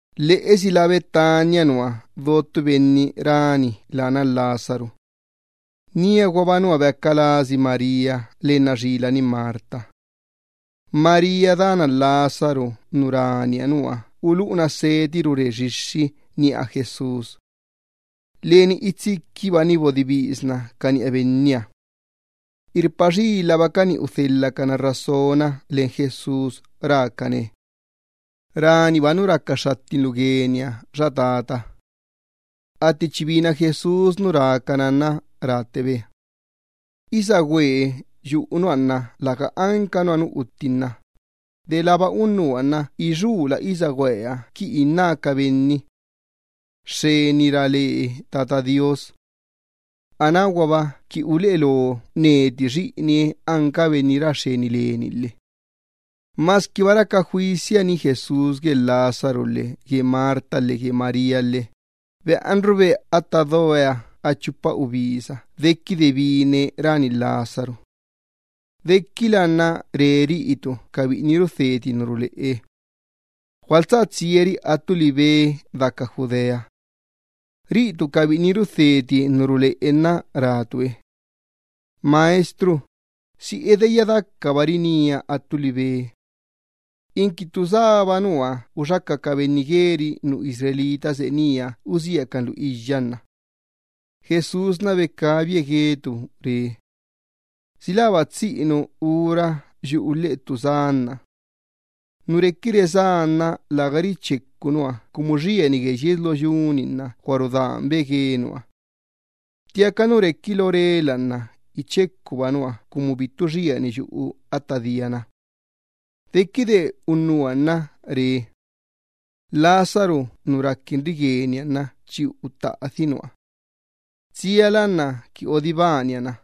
Lheꞌesi lá Betania nua do ttu benni rani lána Lázaro. Níaguaba nua beaca lasi María lenna xilani Marta. María dana Lázaro nu raniha nua uluꞌuna seti rure xixxi niꞌa Jesús. Leni itsiquibani bodibisna ca niꞌa Benniha. Irpa xilabacani udhelhacana rasona len Jesús rácane: —Raniba nu raca xxattinlu gueniha, xa tata. Atti chi bina Jesús nu rá ca nua nna ráttebe: —Isagüee yuꞌu nua nna läga anca nua nu uttin na, delába unnuha nna ixuula isagüeha qui inná ca benni: “¡Xxeni ra le Tata Do Iyyabaaha!”, anáguaba qui uleꞌe lo neti Xiꞌinie-ni anca Benni ra xxeni leni lhe. Masquiba raca juisiani Jesús gue Lázaro lhe gue Marta lhe gue María lhe beꞌanrube atta doe a chupa ubisa dequide bine rani Lázaro. Dequilaha nna re ca biꞌini rudheti ca tisa ruleꞌe: —Gualtsá tsiari attu libe deca Judea. Ca biꞌini rudheti ca tisa ruleꞌe nna rácabi Benniha: —Maestro, ¿si edeyya dacabari nía attu libe? Inqui ttu sába nua uxaca ca benni Israel seꞌe nía usiacan lu iyya nna. Jesús becabie guecabi re: —¿Si läba tsiꞌinu ura yuꞌu lheꞌe ttu sá nna? Nu requi resá nna läga richecu nua cumu xieni gue yies lo yu-ni nna gua rudanbe gue nua. Ttiaca nu requi lo rela nna ichecuba nua cumu bittu xieni yuꞌu atta diana. Dequide unnuha nna re: —Lázaro nu raquinri gueniha nna chi uttaꞌadhi nua. Tsiala qui odibania na.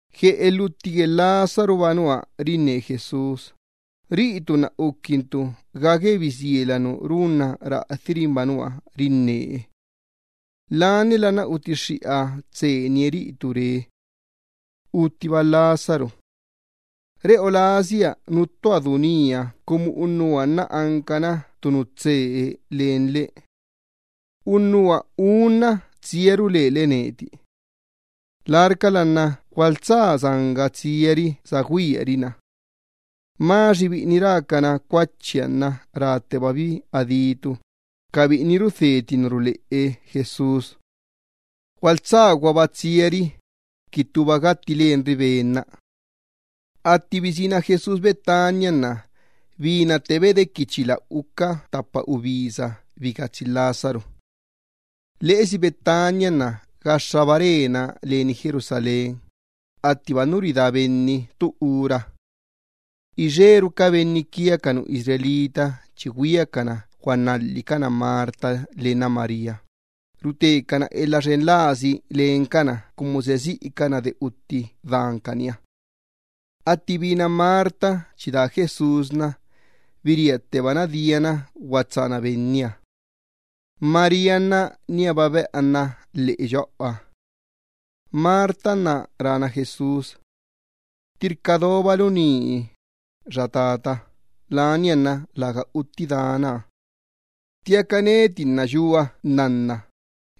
Gue elhutti gue Lázaroba nua rinne Jesús, ca biꞌiniha nna ucaquinbi ga gue bisiela nu runna raꞌadhiri-nba nua rinne Benniha. Laniala nna utixxiꞌa tseenie ca biꞌiniha re cabi: —Uttiba Lázaro. De lebiꞌi nna reꞌo lasia nuttuha du nía cumu unnuha nna ancana ttu nu tsee len lebiꞌi. Unnuha unna tsiaru lele neti. Larcala nna gualtsá sanga tsiari sagüiari na. Tomás biꞌini rácana Cuachiha nna ráttebabi adí ca biꞌini rudheti ca tisa ruleꞌe Jesús: —Gualtsá guaba tsiari, qui ttuba gatti lenri Ben-na. Atti bisína Jesús Betania nna binattebe dequi chila uca ttapa ubisa bigatsi Lázaro. Lheꞌesi Betania nna gaxxaba rena leni Jerusalén, attiba nu ridá benni ttu ura. Ixeru ca benni Israel chi güiacana guanalhicana Marta lenna María, rutecana elha xen lasi lencana cumu seꞌe siꞌicana de utti dancaniha. Atti bina Marta chi daa Jesús, biríattebana diana guatsána Benniha. María nna níaba beꞌanna lheꞌe yoꞌoha. Marta nna rána Jesús: —Ttirca dobalu ni, xa Benni bananie neti, lania nna läga utti danaha. Ttiaca neti nna yua nnanna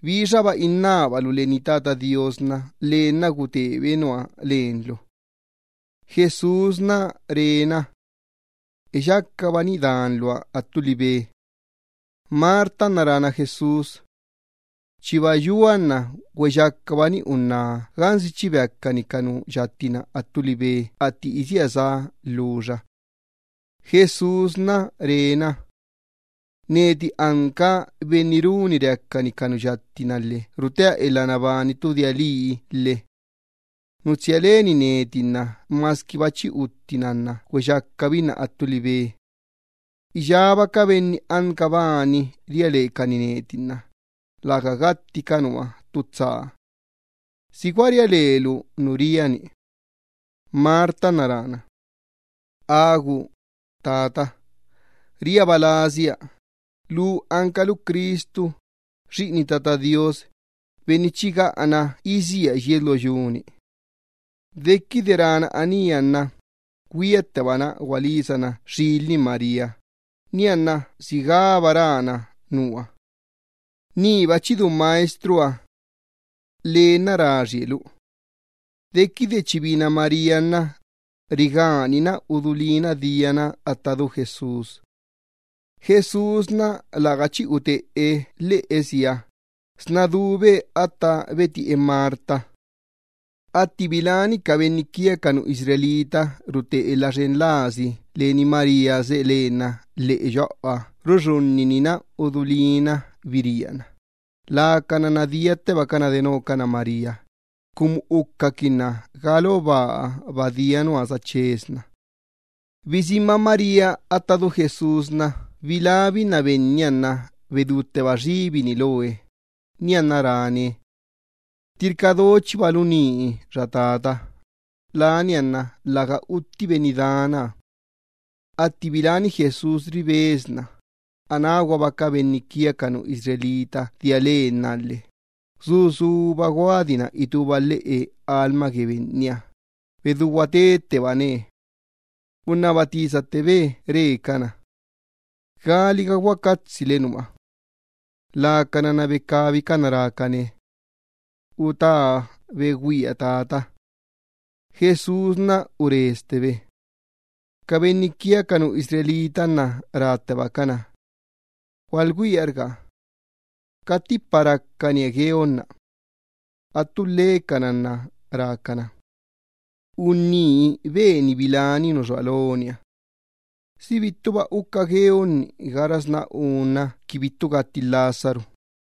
bixaba innábalu leni Tata Do Iyyabaaha, lee nna gutebe nua lenlu. Jesús becabie re na: —Eyacabani danluha attu libe. Marta nna rána Jesús: —Chiba yua nna güeyacabani unná gansi chi beacani ca nu yatti-na attu libe, atti isía sá lhuxa. Jesús re na: —Neti anca benni runi reacani ca nu yatti-na lhe rutea elha nabani ttu dia lii lhe. Nu tsia leni neti nna masquiba chi uttina güeyacabinna attu libe. Iyába ca benni anca bani ria lecani neti nna läga gatti ca nua ttu tsa. ¿Si gua ria lelu nu ria-ni? Marta nna rána: —Agu, Benni bananie neti. Riaba lasia, lu ancalu Cristu, Xiꞌini Tata Do Iyyabaaha, benni chi gaꞌana isía yies lo yu-ni. Dequide rána anía nna, güiattebana gualisana xilani María, nianna sigába rána nua: —Niba chi du Maestroha. Lee nna raxie lu. Dequide chi bina María nna, rigánina udulína diana atta du Jesús. Jesús läga chi uteꞌe lheꞌesiha, sna dube atta betiꞌe Marta. Atti biláni ca benni Israel rute elha xen lasi leni María seꞌe lenna lheꞌe yoꞌoha ruxunninina udulína biríana, lacana nna diattebacana denocana María, cumu ucaquinna ga lo baahaba dia nua sachesna. Bisínba María atta du Jesús, bilábinna Benniha nna bedútteba xibini loe, nianna ráne: —Ttirca dochibalu ni, xa Benni bananie neti, lania nna läga utti benni danaha. Atti biláni Jesús ribesna, anáguaba ca benni Israel dia lennaha lhe, su suba guadina itúba lhiꞌu lheꞌe lastoo Benniha, bedú guatettebane. Unnaba tisattebe re cana: —¿Galiga guacatsile nua? Lacana nna becabicana rácane: —Utá begüia, tata. Jesús uresttebe. Ca benni Israel nna ráttebacana: —Gualgüiarga. ¡Cattipa racanie gueonna! Attu lhecana nna rácana: —Unní beni biláni nu xua loniha. ¿Si bittuba uca gueonni gaxasná unna qui bittu gatti Lázaro?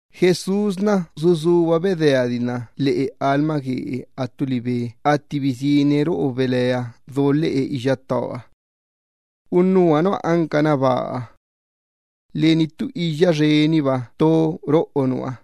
Jesús su suba bedeadina lhiꞌu lheꞌe lastooe attu libe atti bisíne roꞌo belea do lheꞌe iyyattooha. Unnuha nua ancana baa. Leni ttu iyya xeniba to roꞌo nua.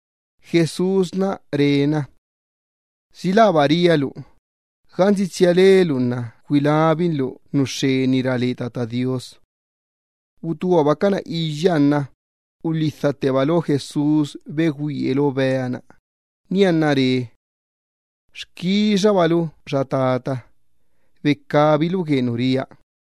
Jesús re na: —¿Si läba ria lu, gansi tsia lelu nna gugüiabalu nu xxeni ra le Tata Do Iyyabaaha? Utúabacana iyyaha nna ulhidhatteba lo Jesús begüie lo bea-na, nianna re: —Xquixarulu, xa Tata, cumu bienbinlu quia.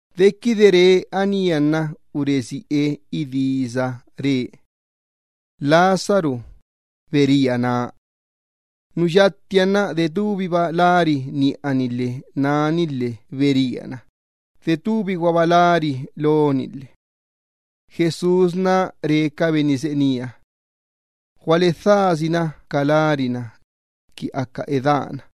Dequide re anía nna uresiꞌe idisa re: —¡Lázaro, bería na! Nu yattiha nna detubiba lari niꞌani lhe náni lhe beríana, detubiguaba lari loni lhe. Jesús re ca benni seꞌe nía: —Gualedhasi na ca lar-na, qui aca edána.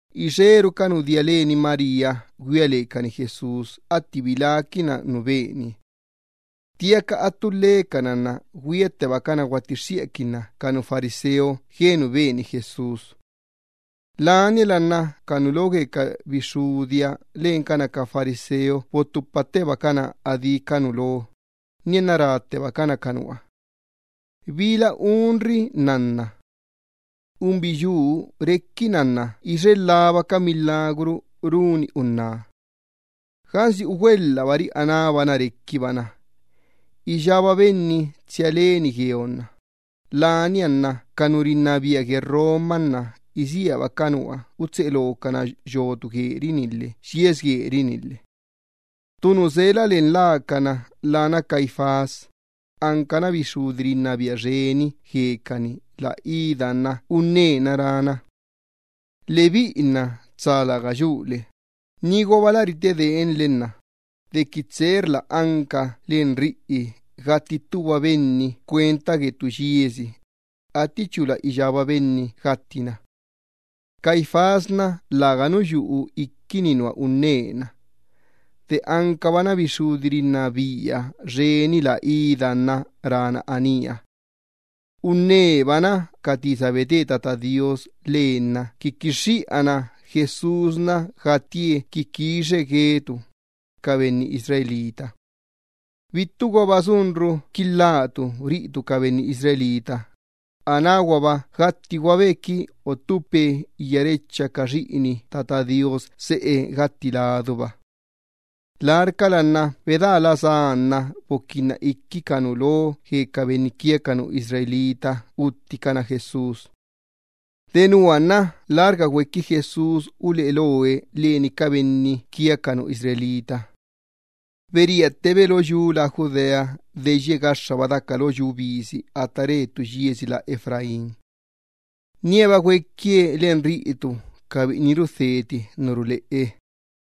Ixeru ca nu dia leni María güia lecani Jesús atti biláquinna nu benie. Ttiaca attu lhecana nna güiattebacana guattixxiꞌaquinna ca fariseo gue nu beni Jesús. Nianna ca nu lo gue ca bixxudiha lencana ca fariseo bottupattebacana ca uxtisi gue ca benni Israel, nianna ráttebacana ca unnuha: —¿Bila unri nnanna? Unbiyuu requina nna ixe lhaba ca milagru runi unná. Gansi ugüelhabari anába na requibana, iyába benni tsia leni gueonna lania nna ca nu rinnabia gue Roma nna isíaba ca nua utseꞌe locana yotu anca leꞌa gueri-ni lhe yies gueri-ni lhe. Ttu nu sela len lacana lána Caifás, ancana bixxudi xxeni rinnabia guecani la ida nna unnena rána: —Lebiꞌi nna tsa läga yule, niguaba lä ritedeenle dequi tseerla anca len riꞌi gatti ttuba benni cuenta gue ttu yiesi, attichula iyába benni gattina. Caifás nna läganu yuꞌu iquini nua unnena. De ancabana bixxudi xxeni rinnabia la idaha nna rána anía. Unnebana ca tisa bete Tata Do Iyyabaaha lenna qui quixxiꞌana Jesús gattie qui quixe nu dica quixa ca benni Israel. Bittuguaba sunru qui lhá ca benni Israel, anáguaba gatti guabe qui ottupe iyárecha ca xiꞌini Tata Do Iyyabaaha seꞌe gatti laduba. Larcala nna bedaa la sá nna boquinna iqui ca nu lo gue ca benni Israel utticana Jesús. Denua nna lärga güequi Jesús uleꞌe loe leni ca benni Israel. Beríattebe lo yu lá Judea deyye gaxxaba daca lo yu bisi atta re ttu yiesi lá Efraín. Níaba güequie leni ca biꞌini rudheti ca tisa ruleꞌe.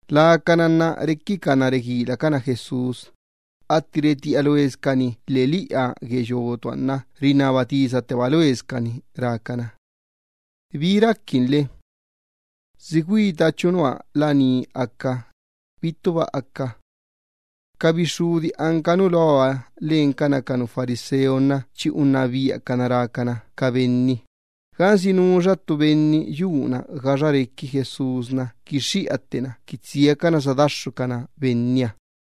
Lacana nna requicana reguilacana Jesús, atti retiꞌa loescani lheꞌeliꞌa gue yotuha nna rinnaba tisatteba loescani rácana: —¿Bi raquinle? ¿Si güitachu nua laní aca, bittuba aca? Ca bixxudi anca nu loha lencana ca fariseo nna chi unnabiacana rácana ca benni, gansi nuxa ttu benni yuna gaxa requi Jesús, quixxiꞌa ttena qui tsiacana sadaxxucana Benniha.